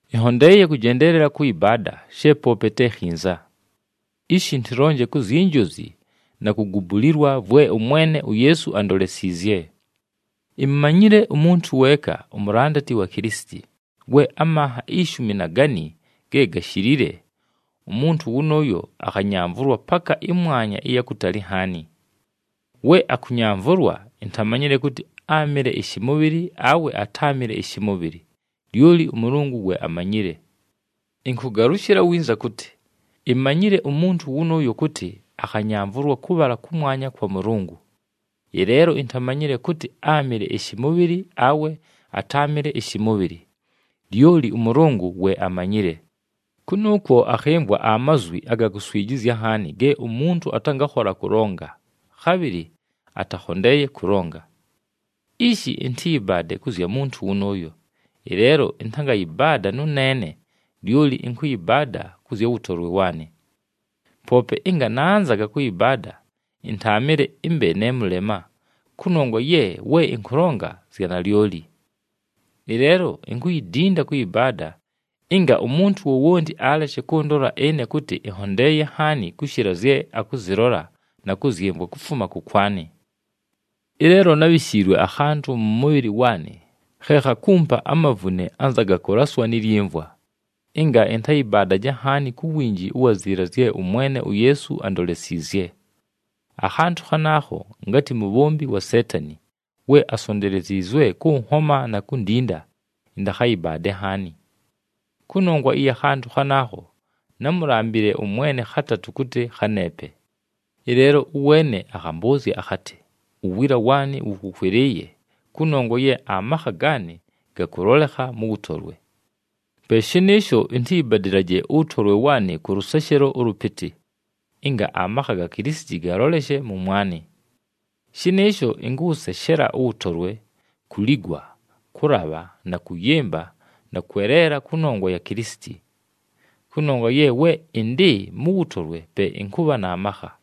Ɨnhondeeye kʉjendeelela kʉyɨbaada, she poope te khinza. Ishi ɨntɨlonje ku zyi njozi na kugubulilwa vwe ʉMwene uYeesu andolesiizye. Imumanyile umuntu weeka umulandati wa Kilisiti, we amanha ishumi na gani ge gashilile, umuntu wʉnʉʉyo akhanyamvʉlwa paka ɨmwanya ɨya kutali nhaani. We akʉnyamvʉlwa, intamanyile kʉtɨ áamɨle ɨshɨmʉbhɨlɨ, awe atáamɨle ɨshɨmʉbhɨlɨ, lyoli ʉMʉlʉngʉ we amanyile. Ɨnkʉgalʉshɨla winza kʉtɨ, imanyile umuntu wʉnʉʉyo kʉtɨ akhanyamvʉlwa kʉbhala kʉmwanya kwa Mʉlʉngʉ. Ɨleelo intamanyile kʉtɨ, áamɨle ɨshɨmʉbhɨlɨ, awe atáamɨle ɨshɨmʉbhɨlɨ, lyoli ʉMʉlʉngʉ we amanyile. Kʉnʉʉkwo akhɨmvwa amazwi aga kuswijizya nhaani ge umuntu atangakhola kʉlonga, khabhɨlɨ atakhondeeye kʉlonga. Ishi ɨntɨyɨbaade kʉ zya muntu wʉnʉʉyo, ɨleelo ɨntangayɨbaada nʉneene, lyoli ɨnkʉyɨbaada kʉ zya wʉtolwe waanɨ. Poope ɨnga nanzaga kʉyɨbaada, ɨntaamɨle ɨmbe ne mʉlema, kʉnongwa ye we ɨnkʉlonga zya nalyoli. Ɨleelo inkuyidinda kʉyɨbaada, ɨnga umuntu wowonti aleshe kʉndola ɨne kʉtɨ ɨnhondeeye nhaani kʉshɨla zye akʉzɨlola na kʉzyɨmvwa kufuma kʉkwanɨ. Ɨleelo nábhishiilwe akhantʉ mʉ mʉbhɨlɨ waanɨ khe khakumpa amavune anza aga kʉlaswa ni lyimvwa, ɨnga ɨntayɨbaadaje nhaani ku winji ʉwa ziila zye ʉMwene uYeesu andolesiizye. Akhantʉ khanaakho ngatɨ mubhombi wa Seetani, we asonteleziizwe kʉnhoma na kundinda ɨntakhayɨbaade nhaani. Kʉnongwa ɨya khantʉ khanaakho, námulambile ʉMwene khatatʉ kʉtɨ khaneepe. Ɨleelo ʉweene akhambʉʉzya akhatɨ, “Uwiila waanɨ wʉkʉkwɨlɨɨye, kʉnongwa ye amakha gaanɨ gakʉlolekha mʉ wʉtolwe.” Pe shɨnɨɨsho, ɨntɨyɨbadɨlaje ʉwʉtolwe waanɨ kʉ lʉseshelo ʉlʉpɨtɨ, ɨnga amakha ga Kilisiti galoleshe mʉmwanɨ. Shɨnɨɨsho, ɨnkʉwʉseshela ʉwʉtolwe, kuligwa, kʉlabha na kʉyɨmba, na kweleela kʉnongwa ya Kilisiti. Kʉnongwa ye we ɨndɨ mʉ wʉtolwe pe ɨnkʉbha na makha.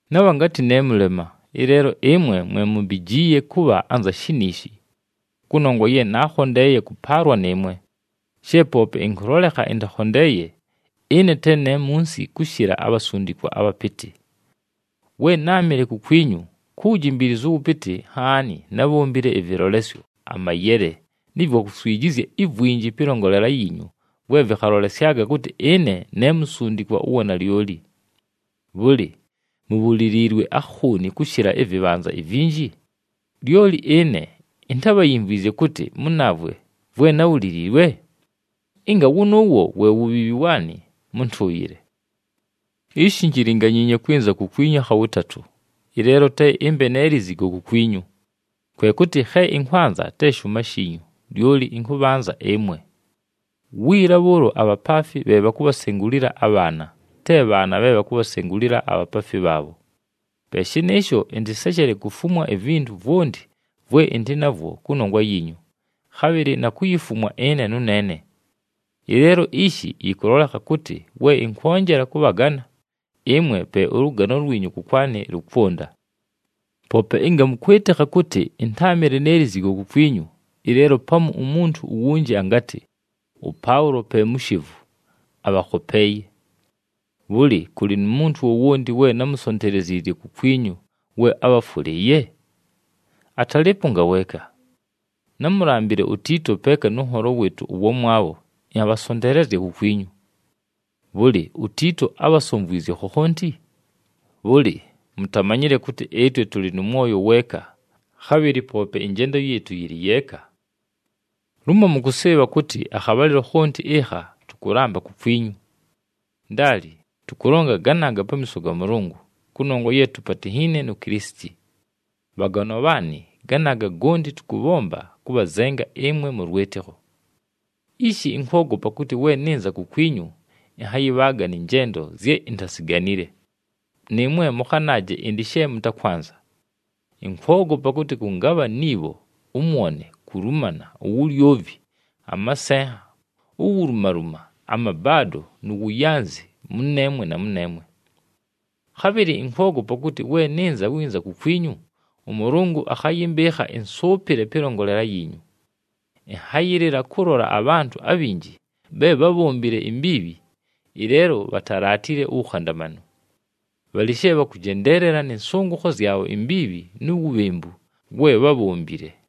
Nabha ngatɨ ne mʉlema, ɨleelo ɨmwe mwe mumbijiiye kʉbha anza shiniishi. Kʉnongwa ye naakhondeeye kʉpaalwa nɨɨmwe, she poope ɨnkʉlolekha ɨntakhondeeye, ɨne te ne munsi kʉshɨla “abhasundikwa abhapɨtɨ.” We náamɨle kukwinyu, ku wujimbiilizu ʉwʉpɨtɨ nhaani nábhombile ɨvɨlolesyo, amayele, nɨ vwa kuswijizya ivwinji pɨlongolela yiinyu vwe vɨkhalolesyaga kʉtɨ ɨne ne musundikwa ʉwa nalyoli. Bhʉlɨ, mubhuliliilwe akhooni kʉshɨla ɨvɨbhanza ivinji, lyoli ɨne intábhayimvwizye kʉtɨ mʉnaavwe vwe nábhuliliilwe? Ɨnga wʉnʉʉwo we wubhiibhi waanɨ, mʉntʉʉyɨle! Ishi injilinganyiinye kwɨnza kukwinyu akha wʉtatʉ, ɨleelo te ɨmbe ne lizigo kukwinyu. Kwe kʉtɨ khe ɨnkwanza te shʉʉma shiinyu, lyoli ɨnkʉbhanza ɨmwe. Wiila bhʉʉlo abhapaafi bhe bhakubhasengulila abhaana, te bhaana bhe bhakubhasengulila abhapaafi bhaabho. Pe shɨnɨɨsho, ɨntɨseshele kufumwa ivintu vwonti vwe ɨndɨ navwo kʉnongwa yiinyu, khabhɨlɨ na kuyifumwa ɨne nʉneene. Ɨleelo ishi yɨkʉlolekha kʉtɨ we ɨnkwonjela kʉbhagana, ɨmwe pe ʉlʉgano lwinyu kʉkwanɨ lʉkwʉnda. Poope ɨnga mʉkwɨtɨkha kʉtɨ ɨntáamɨle ne lizigo kukwinyu, ɨleelo pamu umuntu uwunji angatɨ, “ɄPaʉlo pe mushevu, abhakhopeeye.” Bhʉlɨ, kʉlɨ nu muntu wowonti we námusonteleziizye kukwinyu we abhafwʉlɨɨye? Atalɨɨpo ngaweeka! Námulambile uTiito peeka nʉ nholo wɨɨtʉ ʉwamwabho ɨnhabhasonteelezya kukwinyu. Bhʉlɨ, uTiito ábhasomvwizye khokhonti? Bhʉlɨ, mutamanyile kʉtɨ ɨtwe tʉlɨ nʉ mwoyo weeka, khabhɨlɨ poope ɨnjendo yɨɨtʉ yɨlɨ yeeka! Lumo mʉkʉsɨɨbha kʉtɨ akhabhalɨlo khonti ɨkha, tʉkʉlamba kukwinyu! Ndaali, tʉkʉlonga ganaaga pamiiso ga Mʉlʉngʉ, kʉnongwa ye tupatinhiine nu Kilisiti. Bhaganwa bhaanɨ, ganaaga gonti tʉkʉbhomba kʉbhazenga ɨmwe mʉ lwɨtɨkho. Ishi ɨnkwogopa kʉtɨ, we nɨnza kukwinyu ɨnhayɨbhaaga nɨ njendo zye intaziganile, nɨɨmwe mʉkhanaaje ɨndɨ she mʉtakwanza. Ɨnkwogopa kʉtɨ kʉngabha ni bho, ʉmwone, kulumana, uwulyovi, amasenha, uwulumaluma, amabaado, nu wuyanzi mʉneemwe na mʉneemwe. Khabhɨlɨ ɨnkwogopa kʉtɨ we nɨnza winza kukwinyu, ʉMʉlʉngʉ akhayɨmbɨɨkha ɨnsʉʉpɨle pɨlongolela yiinyu. Ɨnhayɨlɨla kʉlola abhantʉ abhinji bhe bhábhombile imbiibhi, ɨleelo bhatalaatile uwukhandamanu. Bhalɨ she bhakʉjendeelela nɨ nsʉngʉkho zyabho imbiibhi nu wubhembu we bhábhombile.